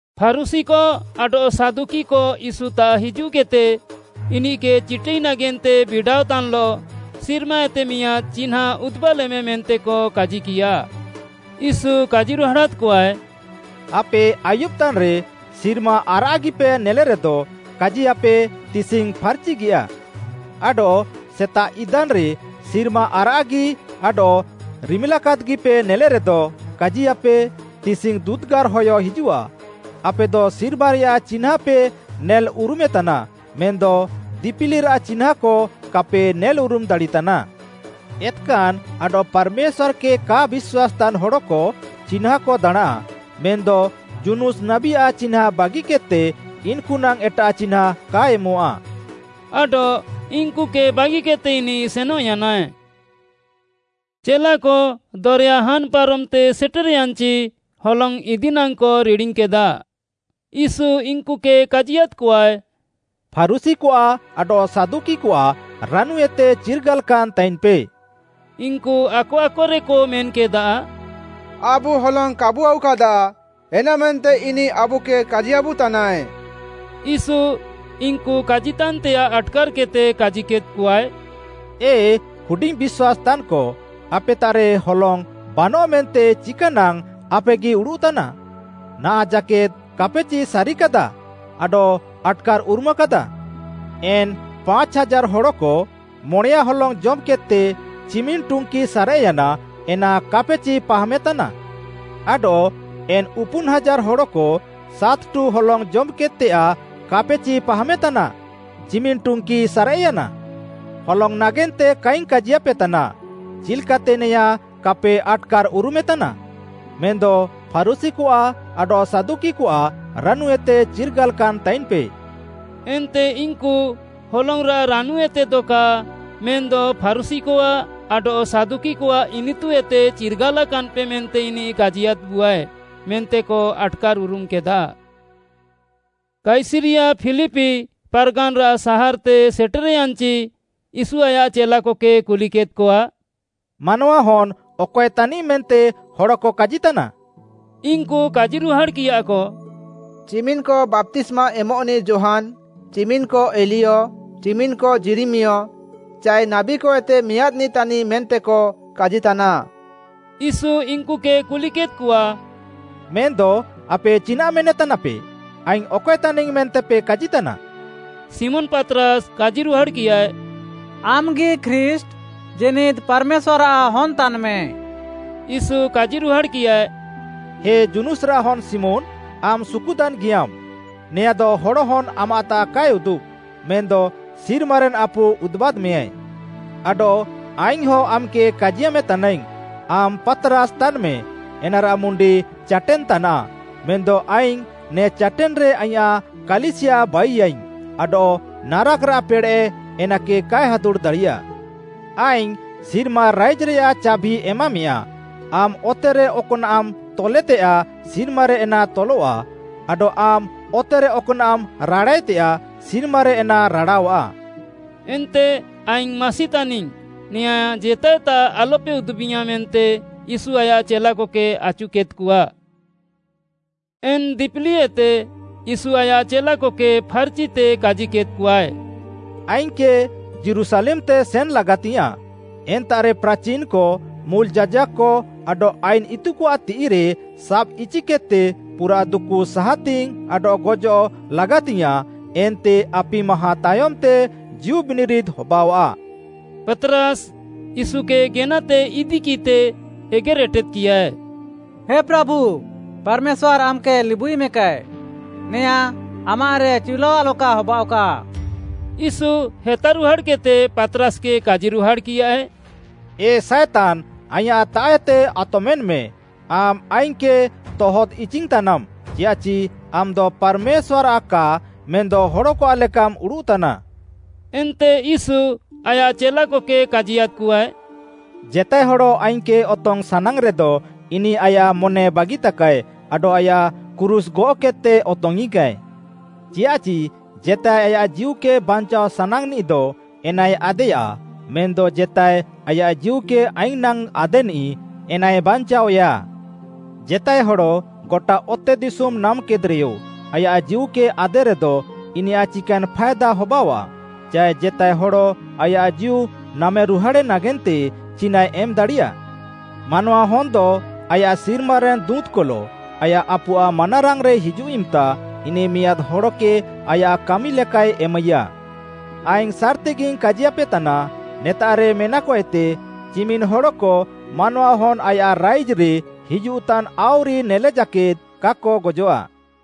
ଫାରୁଶୀକ ଆଡଃ ସାଦୁକିକ ୟୀଶୁତାଃ ହିଜୁଃକେଦ୍‌ତେ, ଇନିଃକେ ଚିଟାଇ ନାଗେନ୍ତେ ବିଡ଼ାଅତାନ୍‌ଲଃ ସିର୍ମାଏତେ ମିଆଁଦ୍‌ ଚିହ୍ନାଁ ଉଦୁବାଲେମେ ମେନ୍ତେକ କାଜିକିୟା। ୟୀଶୁ କାଜିରୁହାଡ଼ାଦ୍‌କଆଏ, “ଆପେ ଆୟୁବ୍‌ତାନ୍‌ରେ ସିର୍ମା ଆରାଃଗିପେ ନେଲେରେଦ, କାଜିୟାଃପେ ତିସିଙ୍ଗ୍‌ ଫାର୍‌ଚିଗିୟା। ଆଡଃ ସେତାଃ ଇଦାନ୍‌ରେ ସିର୍ମା ଆରାଃଗି ଆଡଃ ରିମିଲାକାଦ୍‌ଗିପେ ନେଲେରେଦ, କାଜିୟାଃପେ, ତିସିଙ୍ଗ୍‌ ଦୁଦୁଗାର୍‌ ହୟ ହିଜୁଃଆ। ଆପେଦ ସିର୍ମାରେୟାଃ ଚିହ୍ନାଁପେ ନେଲ୍ଉରୁମେତାନା ମେନ୍‌ଦ ଦିପିଲିରାଃ ଚିହ୍ନାଁକ କାପେ ନେଲ୍ଉରୁମ୍‌ ଦାଡ଼ିତାନ୍‌। ଏତ୍‌କାନ୍‌ ଆଡଃ ପାର୍‌ମେଶ୍ୱାର୍‌କେ କା ବିଶ୍ୱାସ୍‌ତାନ୍‌ ହଡ଼କ ଚିହ୍ନାଁକ ଦାଣାଁଁ, ମେନ୍‌ଦ ଯୁନୁସ୍‌ ନାବୀଆଃ ଚିହ୍ନାଁ ବାଗିକେଦ୍‌ତେ ଇନ୍‌କୁନାଙ୍ଗ୍‌ ଏଟାଃ ଚିହ୍ନାଁ କା ଏମଃଆ।” ଆଡଃ ଇନ୍‌କୁକେ ବାଗିକେଦ୍‌ତେ ଇନିଃ ସେନଃୟାନାଏ। ଚେଲାକ ଦରେୟା ହାନ୍‌ ପାରମ୍‌ତେ ସେଟେର୍‌ୟାନ୍‌ଚି ହଲଙ୍ଗ୍‌ ଇଦି ନାଙ୍ଗ୍‌କ ରିଡ଼ିଙ୍ଗ୍‌କେଦା। ୟୀଶୁ ଇନ୍‌କୁକେ କାଜିୟାଦ୍‌କଆଏ, “ଫାରୁଶୀକଆଃ ଆଡଃ ସାଦୁକିକଆଃ ରାନୁଏତେ ଚିର୍ଗାଲାକାନ୍‌ ତାଇନ୍‌ପେ।” ଇନ୍‌କୁ ଆକ ଆକରେକ ମେନ୍‌କେଦା, “ଆବୁ ହଲଙ୍ଗ୍‌ କାବୁ ଆଉକାଦା ଏନାମେନ୍ତେ ଇନିଃ ଆବୁକେ କାଜିୟାବୁତାନାଏ।” ୟୀଶୁ, ଇନ୍‌କୁ କାଜିତାନ୍‌ତେୟାଃ ଆଟ୍‌କାର୍‌କେଦ୍‌ତେ କାଜିକେଦ୍‌କଆଏ, “ଏ ହୁଡିଙ୍ଗ୍‌ ବିଶ୍ୱାସ୍‌ତାନ୍‌କ, ଆପେତାଃରେ ହଲଙ୍ଗ୍‌ ବାନଃ ମେନ୍ତେ ଚିକାନାଙ୍ଗ୍‌ ଆପେଗି ଉଡ଼ୁଃତାନା? ନାହାଁଃ ଜାକେଦ୍‌ କାପେଚି ସାରିକାଦା ଆଡଃ ଆଟ୍‌କାର୍‌ଉରୁମାକାଦା? ଏନ୍‌ ପାଞ୍ଚ୍‌ ହାଜାର୍‌ ହଡ଼କ, ମଣେୟାଁ ହଲଙ୍ଗ୍‌ ଜମ୍‌କେଦ୍‌ତେ, ଚିମିନ୍‌ ଟୁଙ୍କି ସାରେଃୟାନା ଏନା କାପେଚି ପାହାମେତାନା? ଆଡଃ ଏନ୍‌ ଉପୁନ୍‌ ହାଜାର୍‌ ହଡ଼କ, ସାତ୍‌ଠୁ ହଲଙ୍ଗ୍‌ ଜମ୍‌କେଦ୍‌ତେୟାଃ କାପେଚି ପାହାମେତାନା? ଚିମିନ୍‌ ଟୁଙ୍କି ସାରେଃୟାନା? ହଲଙ୍ଗ୍‌ ନାଗେନ୍ତେ କାଇଙ୍ଗ୍‌ କାଜିୟାପେତାନା, ଚିଲ୍‌କାତେ ନେଆଁଁ କାପେ ଆଟ୍‌କାର୍‌ଉରୁମେତାନା? ମେନ୍‌ଦ ଫାରୁଶୀକଆଃ ଆଡଃ ସାଦୁକିକଆଃ ରାନୁଏତେ ଚିର୍ଗାଲାକାନ୍‌ ତାଇନ୍‌ପେ।” ଏନ୍ତେ ଇନ୍‌କୁ ହଲଙ୍ଗ୍‌ରାଃ ରାନୁଏତେଦ କା ମେନ୍‌ଦ ଫାରୁଶୀକଆଃ ଆଡଃ ସାଦୁକିକଆଃ ଇନିତୁଏତେ ଚିର୍ଗାଲାକାନ୍‌ପେ ମେନ୍ତେ ଇନିଃ କାଜିୟାଦ୍‌ବୁଆଏ ମେନ୍ତେକ ଆଟ୍‌କାର୍‌ଉରୁମ୍‌କେଦା। କାଇସରିୟା ଫିଲିପି ପାର୍‌ଗାନ୍‌ରାଃ ସାହାର୍‌ତେ ସେଟେର୍‌ୟାନ୍‌ଚି ୟୀଶୁ ଆୟାଃ ଚେଲାକକେ କୁଲିକେଦ୍‌କଆ, “ମାନୱାହନ୍‌ ଅକଏ ତାନିଃ ମେନ୍ତେ ହଡ଼କ କାଜିତାନା?” ଇନ୍‌କୁ କାଜିରୁହାଡ଼୍‌କିୟାକ, “ଚିମିନ୍‌କ ବାପ୍ତିସ୍ମା ଏମଃନିଃ ଯୋହାନ୍‌, ଚିମିନ୍‌କ ଏଲିୟ, ଚିମିନ୍‌କ ଯିରିମିୟ ଚାଏ ନାବୀକଏତେ ମିଆଁଦ୍‌ନିଃ ତାନିଃ ମେନ୍ତେକ କାଜିତାନା।” ୟୀଶୁ ଇନ୍‌କୁକେ କୁଲିକେଦ୍‌କଆ, “ମେନ୍‌ଦ ଆପେ ଚିନାଃ ମେନେତାନାପେ? ଆଇଙ୍ଗ୍‌ ଅକଏ ତାନିଙ୍ଗ୍‌ ମେନ୍ତେପେ କାଜିତାନା?” ଶିମୋନ୍‌ ପାତ୍‌ରାସ୍‌ କାଜିରୁହାଡ଼୍‌କିୟାଏ, “ଆମ୍‌ଗି ଖ୍ରୀଷ୍ଟ୍‌, ଜୀନିଦ୍‌ ପାର୍‌ମେଶ୍ୱାର୍‌ଆଃ ହନ୍‌ ତାନ୍‌ମେ।” ୟୀଶୁ କାଜିରୁହାଡ଼୍‌କିୟାଏ, “ହେ ଯୁନୁସ୍‌ରାଃ ହନ୍‌ ଶିମୋନ୍‌, ଆମ୍‌ ସୁକୁତାନ୍‌ଗିୟାମ୍‌, ନେଆଁଦ ହଡ଼ହନ୍‌ ଆମାଃତାଃ କାଏ ଉଦୁବ୍‌, ମେନ୍‌ଦ ସିର୍ମାରେନ୍‌ ଆପୁ ଉଦୁବାଦ୍‌ମେୟାଏ। ଆଡଃ ଆଇଙ୍ଗ୍‌ହଁ ଆମ୍‌କେ କାଜିୟାମେ ତାନାଇଙ୍ଗ୍‌, ଆମ୍‌ ପାତ୍‌ରାସ୍‌ ତାନ୍‌ମେ ଏନାରାଃ ମୁଣ୍ଡି ଚାଟେନ୍‌ ତାନାଃ ମେନ୍‌ଦ ଆଇଙ୍ଗ୍‌ ନେ ଚାଟେନ୍‌ରେ ଆଇଁୟାଃ କାଲିସିୟା ବାଇୟାଇଙ୍ଗ୍‌ ଆଡଃ ନାରାକ୍‌ରାଃ ପେଡ଼େଃ ଏନାକେ କାଏ ହାଦୁଡ଼୍‌ ଦାଡ଼ିୟା। ଆଇଙ୍ଗ୍‌ ସିର୍ମା ରାଇଜ୍‌ରେୟାଃ ଚାଭି ଏମାମେୟାଁ, ଆମ୍‌ ଅତେରେ ଅକ୍‌ନାଃମ୍‌ ତଲେତେୟାଃ, ସିର୍ମାରେ ଏନା ତଲଃଆ, ଆଡଃ ଆମ୍‌ ଅତେରେ ଅକ୍‌ନାଃମ୍‌ ରାଡ଼ାଏତେୟାଃ, ସିର୍ମାରେ ଏନା ରାଡ଼ାଅଃଆ।” ଏନ୍ତେ ଆଇଙ୍ଗ୍‌ ମାସି ତାନିଙ୍ଗ୍‌, ନେଆଁଁ ଜେତାଏତାଃ ଆଲ୍‌ପେ ଉଦୁବିୟାଁ ମେନ୍ତେ ୟୀଶୁ ଆୟାଃ ଚେଲାକକେ ଆଚୁକେଦ୍‌କଆ। ଏନ୍‌ ଦିପିଲିଏତେ ୟୀଶୁ ଆୟାଃ ଚେଲାକକେ ଫାର୍‌ଚିତେ କାଜିକେଦ୍‌କଆଏ, “ଆଇଙ୍ଗ୍‌କେ ଯୀରୁଶାଲେମ୍‌ତେ ସେନ୍‌ ଲାଗାତିଙ୍ଗ୍‌ୟାଁଃ, ଏନ୍ତାଃରେ ପ୍ରାଚିନ୍‌କ, ମୁଲ୍‌ ଯାଜାକ୍‌କ ଆଡଃ ଆଇନ୍‌ ଇତୁକଆଃ ତିଃଇରେ ସାବ୍‌ଇଚିକେଦ୍‌ତେ ପୁରାଃ ଦୁକୁ ସାହାତିଙ୍ଗ୍‌ ଆଡଃ ଗଜଃ ଲାଗାତିଙ୍ଗ୍‌ୟାଁଃ ଏନ୍ତେ ଆପି ମାହାଁ ତାୟମ୍‌ତେ ଜୀଉବିନିରିଦ୍‌ ହବାଅଆଃ।” ପାତ୍‌ରାସ୍‌ ୟୀଶୁକେ ଗେନାତେ ଇଦିକିଃତେ ଏଗେର୍‌ଏଟେଦ୍‌କିୟାଏ। “ହେ ପ୍ରାଭୁ, ପାର୍‌ମେଶ୍ୱାର୍‌ ଆମ୍‌କେ ଲିବୁଇମେକାଏ, ନେଆଁଁ ଆମାଃରେ ଚିଉଲାଅ ଆଲକା ହବାଅଃକା।” ୟୀଶୁ ହେତାରୁହାଡ଼୍‌କେଦ୍‌ତେ ପାତ୍‌ରାସ୍‌କେ କାଜିରୁହାଡ଼୍‌କିୟାଏ, “ଏ ସାଏତାନ୍‌ ଆଇଁୟାଃତାଃଏତେ ଆତମେନ୍‌ମେ, ଆମ୍‌ ଆଇଙ୍ଗ୍‌କେ ତହଦ୍‌ଇଚିଙ୍ଗ୍‌ତାନାମ୍‌, ଚିୟାଃଚି ଆମ୍‌ଦ ପାର୍‌ମେଶ୍ୱାର୍‌ଆଃ କା ମେନ୍‌ଦ ହଡ଼କଆଃ ଲେକାମ୍‌ ଉଡ଼ୁଃତାନା।” ଏନ୍ତେ ୟୀଶୁ ଆୟାଃ ଚେଲାକକେ କାଜିୟାଦ୍‌କଆଏ, “ଜେତାଏ ହଡ଼ ଆଇଙ୍ଗ୍‌କେ ଅତଙ୍ଗ୍‌ ସାନାଙ୍ଗ୍‌ରେଦ ଇନିଃ ଆୟାଃ ମନେ ବାଗିତାକାଏ ଆଡଃ ଆୟାଃ କ୍ରୁଶ୍‌ ଗଅଃକେଦ୍‌ତେ ଅତଙ୍ଗ୍‌ଇଙ୍ଗ୍‌କାଏ। ଚିୟାଃଚି ଜେତାଏ ଆୟାଃ ଜୀଉକେ ବାଞ୍ଚାଅ ସାନାଙ୍ଗ୍‌ନିଃଦ ଏନାଏ ଆଦେୟା ମେନ୍‌ଦ ଜେତାଏ ଆୟାଃ ଜୀଉକେ ଆଇଙ୍ଗ୍‌ ନାଙ୍ଗ୍‌ ଆଦେନିଃ ଏନାଏ ବାଞ୍ଚାଅୟା। ଜେତାଏ ହଡ଼ ଗଟା ଅତେଦିଶୁମ୍‌ ନାମ୍‌କେଦ୍‌ରେୟ ଆୟାଃ ଜୀଉକେ ଆଦେରେଦ ଇନିୟାଃ ଚିକାନ୍‌ ଫାଏଦା ହବାଅଆଃ? ଚାଏ ଜେତାଏ ହଡ଼ ଆୟାଃ ଜୀଉ ନାମ୍‌ରୁହାଡ଼େ ନାଗେନ୍ତେ ଚିନାଃଏ ଏମ୍‌ ଦାଡ଼ିୟା? ମାନୱାହନ୍‌ଦ ଆୟାଃ ସିର୍ମାରେନ୍‌ ଦୁଁତ୍‌କଲଃ ଆୟାଃ ଆପୁଆଃ ମାନାରାଙ୍ଗ୍‌ରେ ହିଜୁଃ ଇମ୍‌ତା ଇନିଃ ମିଆଁଦ୍‌ ହଡ଼କେ ଆୟାଃ କାମିଲେକାଏ ଏମାଇୟା। ଆଇଙ୍ଗ୍‌ ସାର୍‌ତିଗିଙ୍ଗ୍‌ କାଜିୟାପେତାନା, ନେତାଃରେ ମେନାକଏତେ ଚିମିନ୍‌ ହଡ଼କ ମାନୱାହନ୍‌ ଆୟାଃ ରାଇଜ୍‌ରେ ହିଜୁଃତାନ୍‌ ଆଉରିକ ନେଲେ ଜାକେଦ୍‌ କାକ ଗଜଃଆ।”